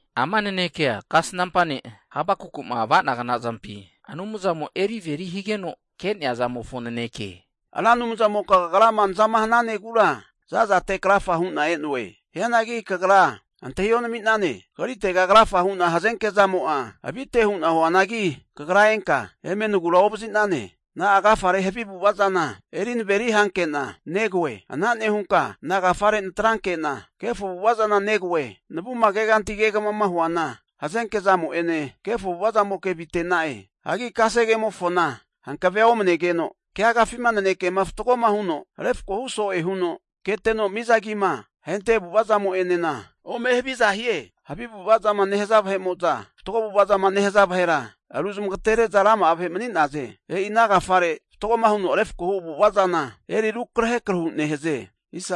Ama nanekea kasnampa ne' Habakukuma ava'nagna zampi Anumzamo eri averi higeno ke'nea zamofo naneke. Ra Anumzamoka kagrama nazama hananegura za'zate krafa hu'na e'noe. Hianagi kagra antahi onami'nane. Kagritega krafa hu'na hazenke zamo'a avite hu'na huanagi, kagra enka eme nagura ovazi'nane. Na'a agafare havi avu'ava zana eri naveri hanke'na negoe? Ana nehunka nagafare natranke'na kefo avu'ava zana negoe? Navuma keganti kegamama huana, hazenke zamo'ene kefo avu'ava zamoke avite'na'e. Hanki kasegemofona hankave'a omanegeno, keagafima nanekema fatgoma huno refko hu so'e huno keteno miza agima ahente avu'ava zamo'enena ome haviza hie. Havi avu'ava zama nehaza vahe'mo'za, fatgo avu'ava zama nehaza vahera ru zamagatere'za rama'a vahe mani'naze. E'i ana agafare fatgoma huno refkohu avu'ava zana eri rukrahe krahu nehaze.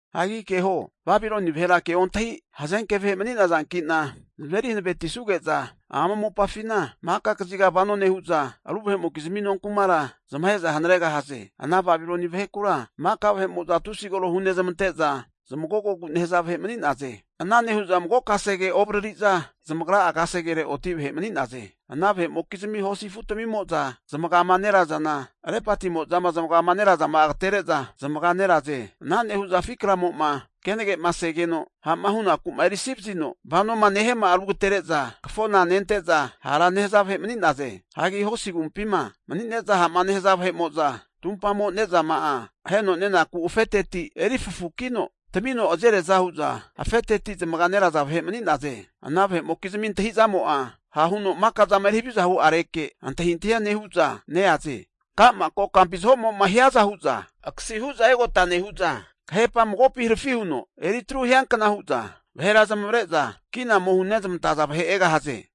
Hagi keho, Babiloni vahera kea ontahi hazenke vahe mani'nazanki'na zamazeri hankavetisuge'za ama mopafina maka kaziga vano nehu'za, ru vahe'mokizmi nonkumara zamahe'za hanaregahaze. Ana Babiloni vahekura maka vahe'mo'za tusi koro hunezmante'za zmagogogu nehaza vahe mani'naze. Ana nehu'za mago kasegea ovariri'za zamagra'a kasegere oti vahe mani'naze. Ana vahe'mokizmi hosi afu tamimo'za zamagama nerazana, lepatimoza'ma zamagama nerazama'a agatere'za zamaga neraze. Ana nehu'za afi kramo'ma kenagema segeno ha'ma hunaku'ma erisivazino vanoma nehiama'a, rugatere'za kafona nente'za hara nehaza vahe mani'naze. Hagi hosi agumpima mani'neza ha'ma nehaza vahe'mo'za tumpamo ne'zama'a aheno nenaku afeteti eri fafukino tamino azeriaza hu'za afeteti zamaga neraza vahe mani'naze. Ana vahe'mokizmi antahi'zamo'a, ha' huno maka zama eri haviza hu'areke antahintahia nehu'za neaze. Ka'ma kokampi zahomo'ma hiaza hu'za akasi hu'za egota nehu'za, kahepama magopi harafi huno eri atru hiankna hu'za, vahera zamavare'za kina ome hunezmantaza vahe egahaze.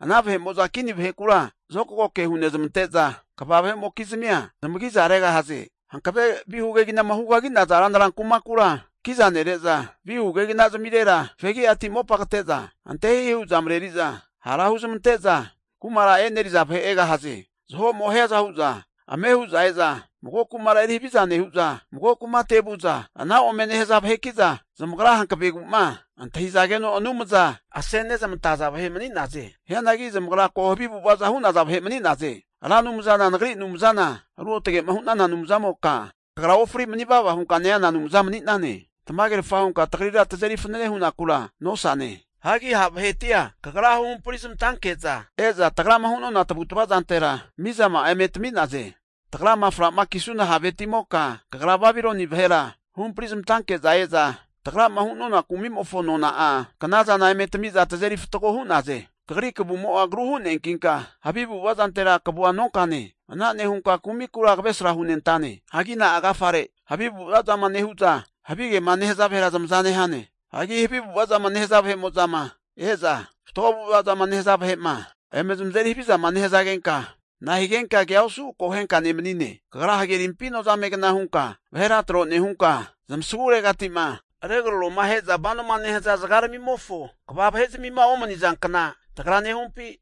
Ana vahe'mo'za kini vahekura zokagoke hunezmante'za, kva vahe'mokizmia zamagi'za regahaze. Hankave vihu keginama hugagi'naza ranra kumakura kiza nere'za, vihu kegina zamirera fegiati mopa kate'za ante hihi hu'za mareri'za hara huzmante'za kumara e'neriza vahe egahaze. Zaho'mo hiaza hu'za ame hu'za e'za mago kumara eri haviza nehu'za, mago kumate vu'za ana ome nehaza vaheki'za, zamagra hankavegu'ma antahizageno anumza asenezmantea vahe mani'naze. Hianagi zamagra ko havi avu'ava hu'naza vahe mani'naze. Ra Anumzana nagri Anumzana Ruotage'ma hu'nana Anumzanimoka, kagra ofri mani vava hunka neana Anumza mani'nane. Tamagerfa hunka tagrira tazeri fanane hunakura nosane. Hagi ha' vahetia Kagra huhampari zamantanke'za e'za tagrama hu'nona tavutava zantera mizama'a eme tami'naze. Tagrama fra'ma kisuna haveti'moka, Kagra Babiloni vahera huhampri zmantanke'za e'za tagrama hu'nona kumimofo nona'a knazana eme tamiza tazeri fatgo hu'naze. Kagri kavumo'a agru hu'neankinka havi avu'ava zantera kavua nonkane. Ana nehunka kumikura kavesra hunentane. Hagi na'a agafare havi avu'ava zama nehu'za havigema nehaza vahera zamaza nehane? Hagi havi avu'ava zama nehaza vahe'mo'zama e'za, fatgo zamavu zamava'ma nehaza vahe'ma eme zamazeri havizama nehazagenka, na'a higenka kea osu akohenka nemani'ne? Kagra hagerimpi nozamegna hunka vahera tro nehunka, zamasaguregati'ma regraroma ahe'za vanoma nehaza zagaramimofo kva vahe'zamima omani'nazankna tagra nehumpi?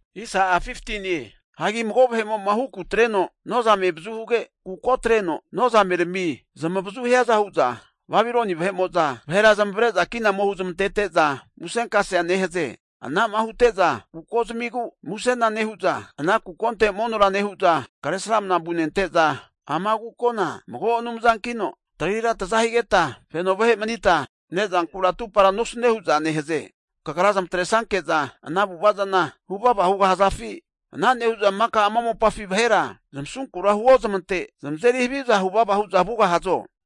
Hagi mago vahemo'ma huku atreno nozame avazu huge, kuko atreno nozamerami zamavazu hiaza hu'za Babiloni vahe'mo'za vahera zamavare'za kina ome huzmantete'za musenkasea nehaze. Ana'ma hute'za kuko zamigu musena nehu'za, ana kukonte monora nehu'za Kresramana vunente'za, ama kukona mago anumzankino tagrira taza higeta feno vahe manita ne'zankura atupara nosune hu'za nehaze. Kagra zamatresanke'za ana avu'ava zana hu'za vuvava hugahazafi? Ana nehu'za maka ama mopafi vahera zamasunkura huozamante zamazeri haviza huvava hu'za vugahazo?